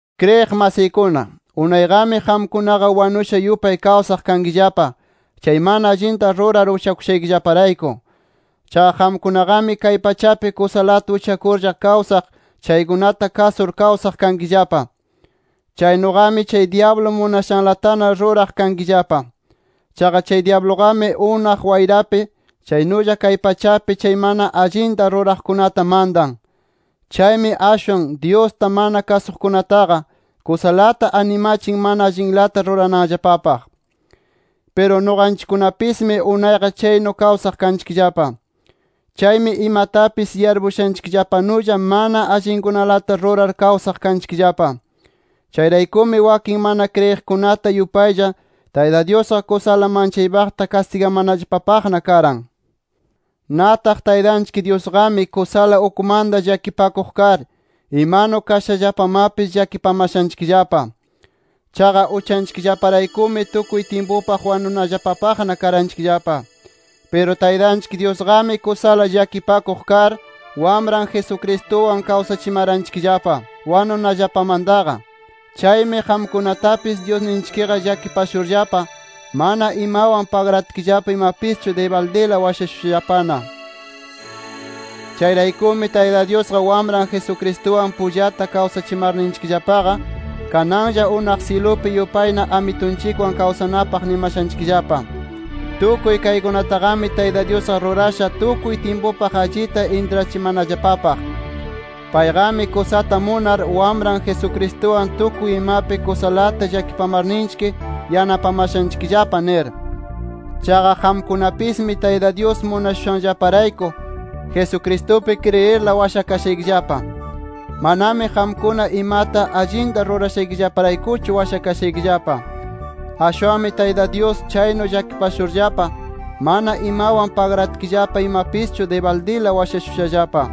Kriyiq masiykuna, unayqami qamkunaqa wanusha yupay kawsaq kankillapa, chay mana allinta rurar uchakushaykillaparayku. Chaqa qamkunaqami kay pachapi kusalata uchakurlla kawsaq chaykunata kasur kawsaq kankillapa. Chaynuqami chay dyablu munashanlatana ruraq kankillapa. Chaqa chay dyabluqami unaq wayrapi chaynulla kay pachapi chay mana allinta ruraqkunata mantan. Chaymi ashwan, Dyusta mana kasuqkunataqa kusalata animachin, mana allinlata rurananllapapaq. Piru nuqanchikkunapismi unayqa chaynu kawsaq kanchikllapa. Chaymi imatapis yarpushanchikllapanulla mana allinkunalata rurar kawsaq kanchikllapa. Chayraykumi wakin mana kriyiqkunata yupaylla, Tayta Dyusqa kusala manchaypaqta kastigamanallapapaqna karan. Nataq Taytanchik Dyusqami, kusala ukmanta llakipakuq kar, imanu kashallapamapis llakipamashanchikllapa. Chaqa uchanchikllaparaykumi tukuy tyimpupaq wanunallapapaqna karanchikllapa. Piru Taytanchik Dyusqami kusala llakipakuq kar, Wamran Jesucristuwan kawsachimaranchikllapa wanunallapamantaqa. Chaymi qamkunatapis Dyusninchikqa llakipashurllapa mana imawan pagratkillapa imapischu dibaldila washashushallapana. Chayraykumi Tayta Dyusqa Wamran Jesucristuwan pullata kawsachimarninchikllapaqa, kananlla unaq syilupi yupayna Amitunchikwan kawsanapaq nimashanchikllapa. Tukuy kaykunataqami Tayta Dyusqa rurasha tukuy tyimpupaq allita intrachimanallapapaq, ¡payqami kusata munar, Wamran Jesucristuwan tukuy imapi kusalata llakipamarninchik yanapamashanchikllapa! nir. Chaqa qamkunapismi Tayta Dyus munashushanllaparayku, Jesucristupi kriyirla washakashaykillapa. Manami qamkuna imata allinta rurashaykillaparaykuchu washakashaykillapa. Ashwanmi Tayta Dyus chaynu llakipashurllapa, mana imawan pagratkillapa imapischu dibaldila washashushallapa.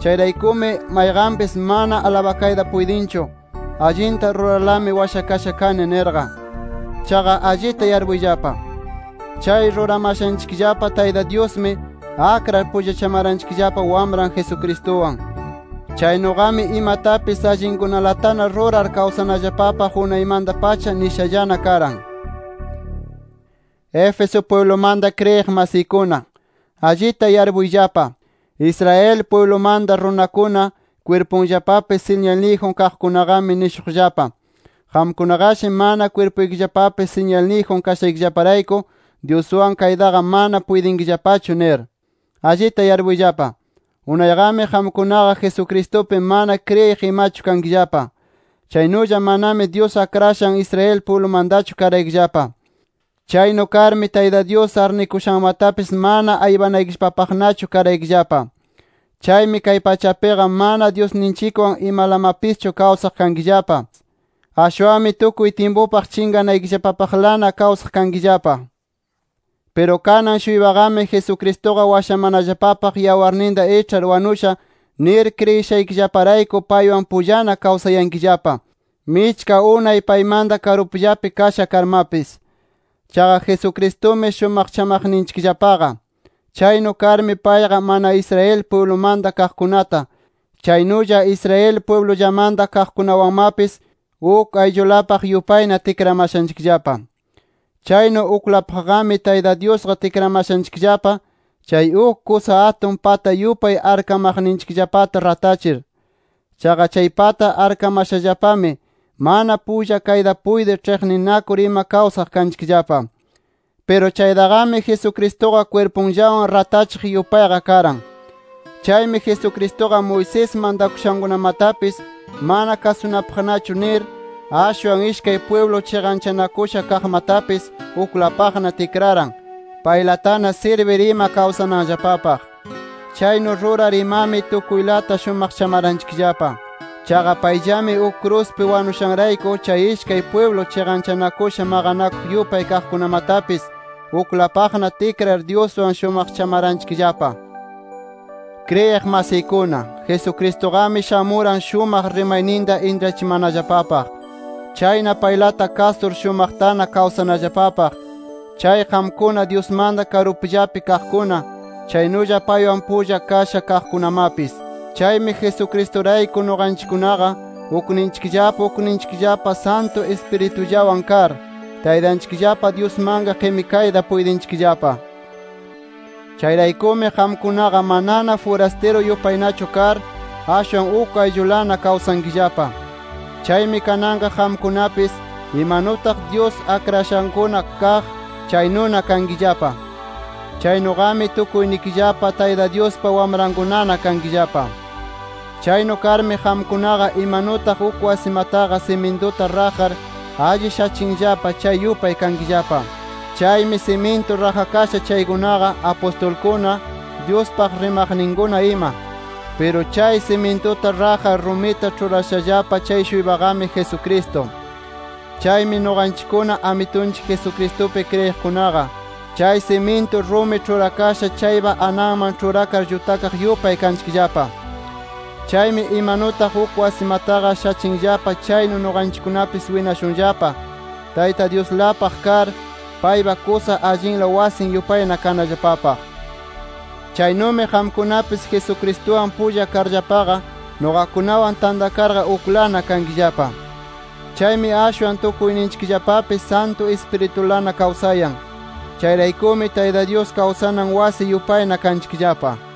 Chayraykumi mayqanpis mana alabakayta puytinchu, allinta rurarlami washakasha kani nirqa. Chaqa allita yarpuyllapa: Chay ruramashanchikllapa Tayta Dyusmi akrar pullachamaranchikllapa Wamran Jesucristuwan. Chaynuqami imatapis allinkunalatana rurar kawsanallapapaq unaymanta-pacha, nishallana karan. Éfeso pwiblumanta kriyiq masiykuna, allita yarpuyllapa: Israel pwiblumanta runakuna kwirpunllapapi siñalniyjun kaqkunaqami, nishuqllapa: “Qamkunaqashi mana kwirpuykillapapi siñalniyjun kashaykillaparayku, Dyuswan kaytaqa mana puytinkillapachu” nir. Allita yarpuyllapa: Unayqami qamkunaqa, Jesucristupi mana kriyiq imachu kankillapa. Chaynulla manami Dyus akrashan Israel pwiblumantachu karaykillapa. Chaynu karmi Tayta Dyus arnikushanmatapis mana aypanaykillapapaqnachu karaykillapa. Chaymi kay pachapiqa mana Dyusninchikwan imalamapischu kawsaq kankillapa. Ashwanmi tukuy tyimpupaq chinqanaykillapapaqlana kawsaq kankillapa. Piru kanan-shuypaqami Jesucristuqa washamanallapapaq yawarninta iĉhar wanusha nir kriyishaykillaparayku, paywan pullana kawsayankillapa, michka unay paymanta karupllapi kasha karmapis. Chaqa Jesucristumi shumaqchamaqninchikllapaqa. Chaynu karmi payqa mana Israel pwiblumanta kaqkunata, chaynulla Israel pwiblullamanta kaqkunawanmapis, uk ayllulapaq yupayna tikramashanchikllapa. Chaynu uklapaqqami Tayta Dyusqa tikramashanchikllapa, chay uk kusa atun pata yupay arkamaqninchikllapata ratachir. Chaqa chay pata arkamashallapami, mana pulla kayta puytir, ĉhiqninakur ima kawsaq kanchikllapa. Piru chaytaqami Jesucristuqa kwirpullawan ratachiq yupayqa karan. Chaymi Jesucristuqa, Moisés mantakushankunamatapis mana kasunapaqnachu nir, ashwan ishkay pwiblu chiqanchanakusha kaqmatapis uklapaqna tikraran, paylatana sirbir ima kawsananllapapaq. Chaynu rurar imami tukuylata shumaqchamaranchikllapa. Chaqa payllami uk kruspi wanushanrayku, chay ishkay pwiblu chiqanchanakusha maqanakuq yupay kaqkunamatapis uklapaqna tikrar, Dyuswan shumaqchamaranchikllapa. Kriyiq masiykuna, Jesucristuqami, shamuran shumaq rimayninta intrachimanallapapaq. Chayna paylata kasur shumaqtana kawsanallapapaq, chay qamkuna Dyusmanta karupllapi kaqkuna, chaynulla paywan pulla kasha kaqkunamapis. Chaymi Jesucristurayku nuqanchikkunaqa ukninchikllapa ukninchikllapa Santu Ispiritullawan kar, Taytanchikllapa Dyusmanqa qimikayta puytinchikllapa. Chayraykumi qamkunaqa manana furastiru yupaynachu kar, ashwan uk ayllulana kawsankillapa. Chaymi kananqa qamkunapis, imanutaq Dyus akrashankuna kaq, chaynuna kankillapa. Chaynuqami tukuynikillapa Tayta Dyuspa wamrankunana kankillapa. Chaynu karmi qamkunaqa imanutaq uk wasimataqa simintuta rajar alli shachinllapa, chay yupay kankillapa. Chaymi simintu rajakasha chaykunaqa, apustulkuna, Dyuspaq rimaqninkuna ima. Piru chay simintuta rajar rumita ĉhurashallapa chay-shuypaqami, Jesucristo. Chaymi nuqanchikkuna Amitunchik Jesucristupi kriyiqkunaqa, chay simintu rumi ĉhurakasha chaypa ananman ĉhurakar llutakaq yupay kanchikllapa. Chaymi imanutaq uk wasimataqa shachinllapa chaynu nuqanchikkunapis winashunllapa, Tayta Dyuslapaq kar, paypa kusa allinla wasin yupayna kanallapapaq. Chaynumi qamkunapis Jesucristuwan pulla karllapaqa, nuqakunawan tantakarqa uklana kankillapa. Chaymi ashwan tukuyninchikllapapi Santu Ispiritulana kawsayan. Chayraykumi Tayta Dyus kawsanan wasi yupayna kanchikllapa.